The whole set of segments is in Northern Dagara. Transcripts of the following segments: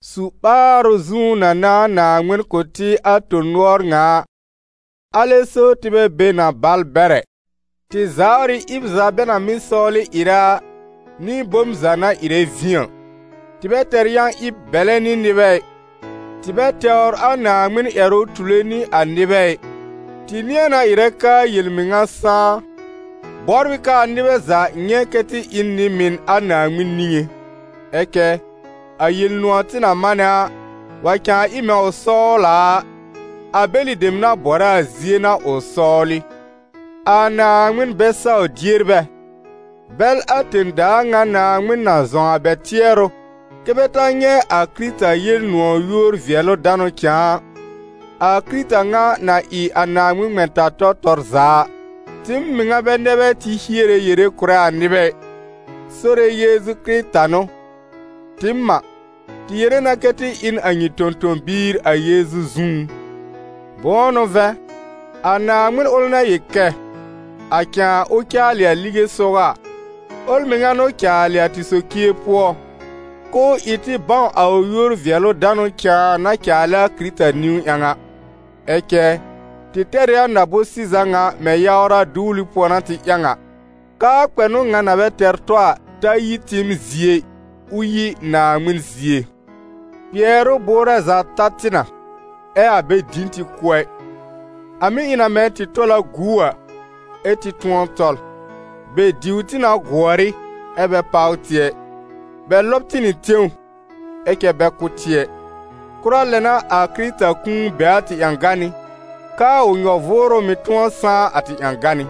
Su-ɓaarʋ zũú na n'a Naaŋmɩn kʋ̀ tɩ a tõ-nʋɔr ŋa a, alɛ so tɩ bɛ be na bal bɛr ɛ. Tɩ zawr ɩ ɩb za bɛ na mɩ́ sɔwlɩ ɩrɛ a, nɩ bom za na ɩrɛ vĩ a. Tɩ bɛ tɛr yã-ɩb bɛlɛ nɩ nɩbɛ ɩ, tɩ bɛ tɛwr a Naaŋmɩn ƴɛrʋ tule nɩ a nɩbɛ ɩ, tɩ nɩ̃ɛ na ɩrɛ k'aa yel-mɩŋa sãá, bɔbr ɩ k'aa nɩbɛ za nyɛ̃ kɛ́ tɩ ɩ n nɩ-mɩn a Naaŋmɩn niŋé. Ɛ cɛ a Yel-nʋ̃ɔ̀ tɩ na manɛ a, wa cãa ɩ mɛ̃ ʋ sɔwl a a, a bɛlɩ dem na bɔrɛ a zie n'a ʋ sɔwlɩ, a Naaŋmɩn bɛ-saw-dierbɛ, bɛl a tẽ-daa ŋa naaŋmɩn na zɔ̃w a bɛ tɩɛrʋ, kɛ́ bɛ ta nyɛ̃ a Kɩrɩta Yel-nʋ̃ɔ̀ yúor-vɩɛlʋ-danʋ cãa a, a Kɩrɩta ŋa na ɩ a Naaŋmɩn ŋmɛ̃-ta-tɔ tɔr za a. Tɩɩm mɩŋa bɛ nɛ bɛ tɩ hiere yere kʋ̀rɛ a nɩbɛ ɩ, Sore Yeezu Kɩrɩta n'ʋ. Tɩɩm a, tɩ yere na kɛ tɩ ɩ n a nyɩ tõ-tõ-biir a Yeezu zũú. Bʋ̃ʋ n'ʋ vɛ̃, a Naaŋmɩn ʋl na yel kɛ: «A cãa, ʋ caalɩ a lige sɔgɔ a», ʋl mɩŋa n'ʋ caalɩ a tɩ socie pʋɔ, k'ʋʋ ɩ tɩ bãw a ʋ yúor-vɩɛlʋ-danʋ cãa na caalɛ a Kɩrɩta niwn ƴãw a. Ɛ cɛ tɩ tɛr ɩ a na-bʋ̃-sɩza ŋa mɛ̃ yawra duwli pʋɔ n'a tɩ ƴãw a, k'aa kpɛnʋ ŋa na bɛ tɛr tɔ a, ta yi tɩɩm zie ɩ, ʋ yi Naaŋmɩn zie. Kpɩɛrʋ bʋʋrɛ za ta tɩ na, ɛ́ a bɛ dĩ tɩ kʋ́ ɛ; a mɩ́ ɩ na mɛ̃ tɩ na tɔl a gu a, ɛ́ tɩ tʋ̃ɔ tɔl; bɛ diw tɩ na gʋɔr ɩ, ɛ́ bɛ páw tɩ ɛ; bɛ lɔb tɩ nɩ tẽw, ɛ cɛ bɛ kʋ́ tɩ ɛ. Kʋra lɛ n'a a Kɩrɩta kũu be a tɩ ƴãganɩ́, k'aa ʋ nyɔ-vʋʋrʋ mɩ̀ tʋ̃ɔ sãá a tɩ ƴãganɩ́.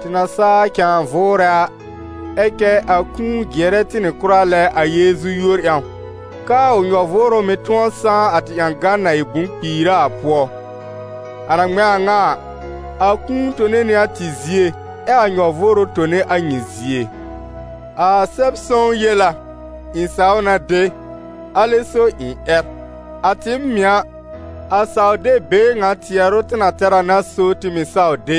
Tɩ na saa cãa vʋʋrɛ a, ɛ cɛ a kũu jɩɛrɛ tɩ nɩ kʋra lɛ a Yeezu yúor ƴãw, k'aa ʋ nyɔ-vʋʋrʋ mɩ̀ tʋ̃ɔ sãá a tɩ ƴãgan na ɩ bʋ̃-kpiira a pʋɔ. A na ŋmɛ̃ a ŋa a, a kũu tone nɩ a tɩ zie, ɛ a nyɔ-vʋʋrʋ tone a nyɩ zie. A Sɛb-sõw yel a: «Ɩ̃ saw na de, alɛ so ɩ̃ ƴɛr.» A tɩɩm mɩ̀, a saw-deb-been ŋa tɩɛrʋ tɩ na tɛr a n'a so tɩ mɩ̀ saw de,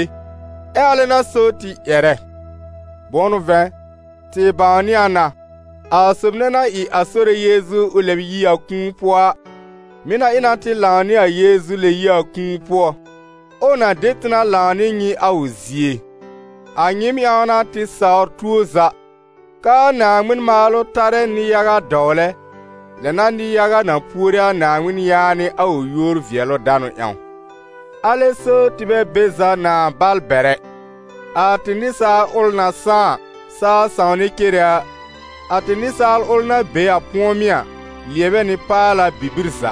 ɛ alɛ n'a so tɩ ƴɛrɛ. Bʋ̃ʋ n'ʋ vɛ̃, tɩ bãwnɩ a na, a sob nɛ na ɩ a Sore Yeezu ʋ lɛb yi a kũu pʋɔ a, mɩ̀ na ɩ na tɩ lãw nɩ a Yeezu lɛb yi a kũu pʋɔ, ɛ ʋ na de tɩ na lãw nɩ nyɩ a ʋ zie. A nyɩɩm ƴãw n'a tɩ sawr tuo za, k'aa Naaŋmɩn maalʋ tarɛ nɩ-yaga dɔwlɛ, lɛ n'a nɩ-yaga na puore a Naaŋmɩn yaanɩ a ʋ yúor-vɩɛlʋ-danʋ ƴãw. Alɛ so tɩ bɛ be za nãa bal bɛr ɛ. A tɩ nɩsaal ʋl na sãá a, saa sãwnɛ cere a, a tɩ nɩsaal ʋl na be a pʋ̃ɔmɩ́ a, lɩɛbɛ nɩ paala bibir za.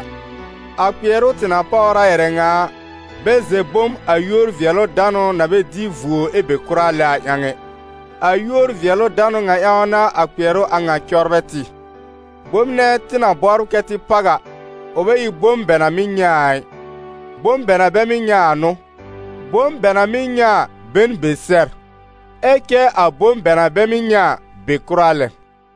A kpɩɛrʋ tɩ na páwr a ƴɛrɛ ŋa a, bɛ zɛ̃ bom a yúor-vɩɛlʋ-danʋ na bɛ dɩ vuo ɛ be kʋra lɛ a ƴãw ɛ. A yúor-vɩɛlʋ-danʋ ŋa ƴãw n'a a kpɩɛrʋ a ŋa cɔbrɛ tɩ. Bom nɛ tɩ na bɔbr kɛ́ tɩ páw a, ʋ bɛ ɩ bom bɛ na mɩ́ nyɛ̃ a ɩ, bom bɛ na bɛ mɩ́ nyɛ̃ a n'ʋ. Bom bɛ na mɩ́ nyɛ̃ a be n be sɛr, ɛ cɛ a bom bɛ na bɛ mɩ́ nyɛ̃ a, be kʋra lɛ.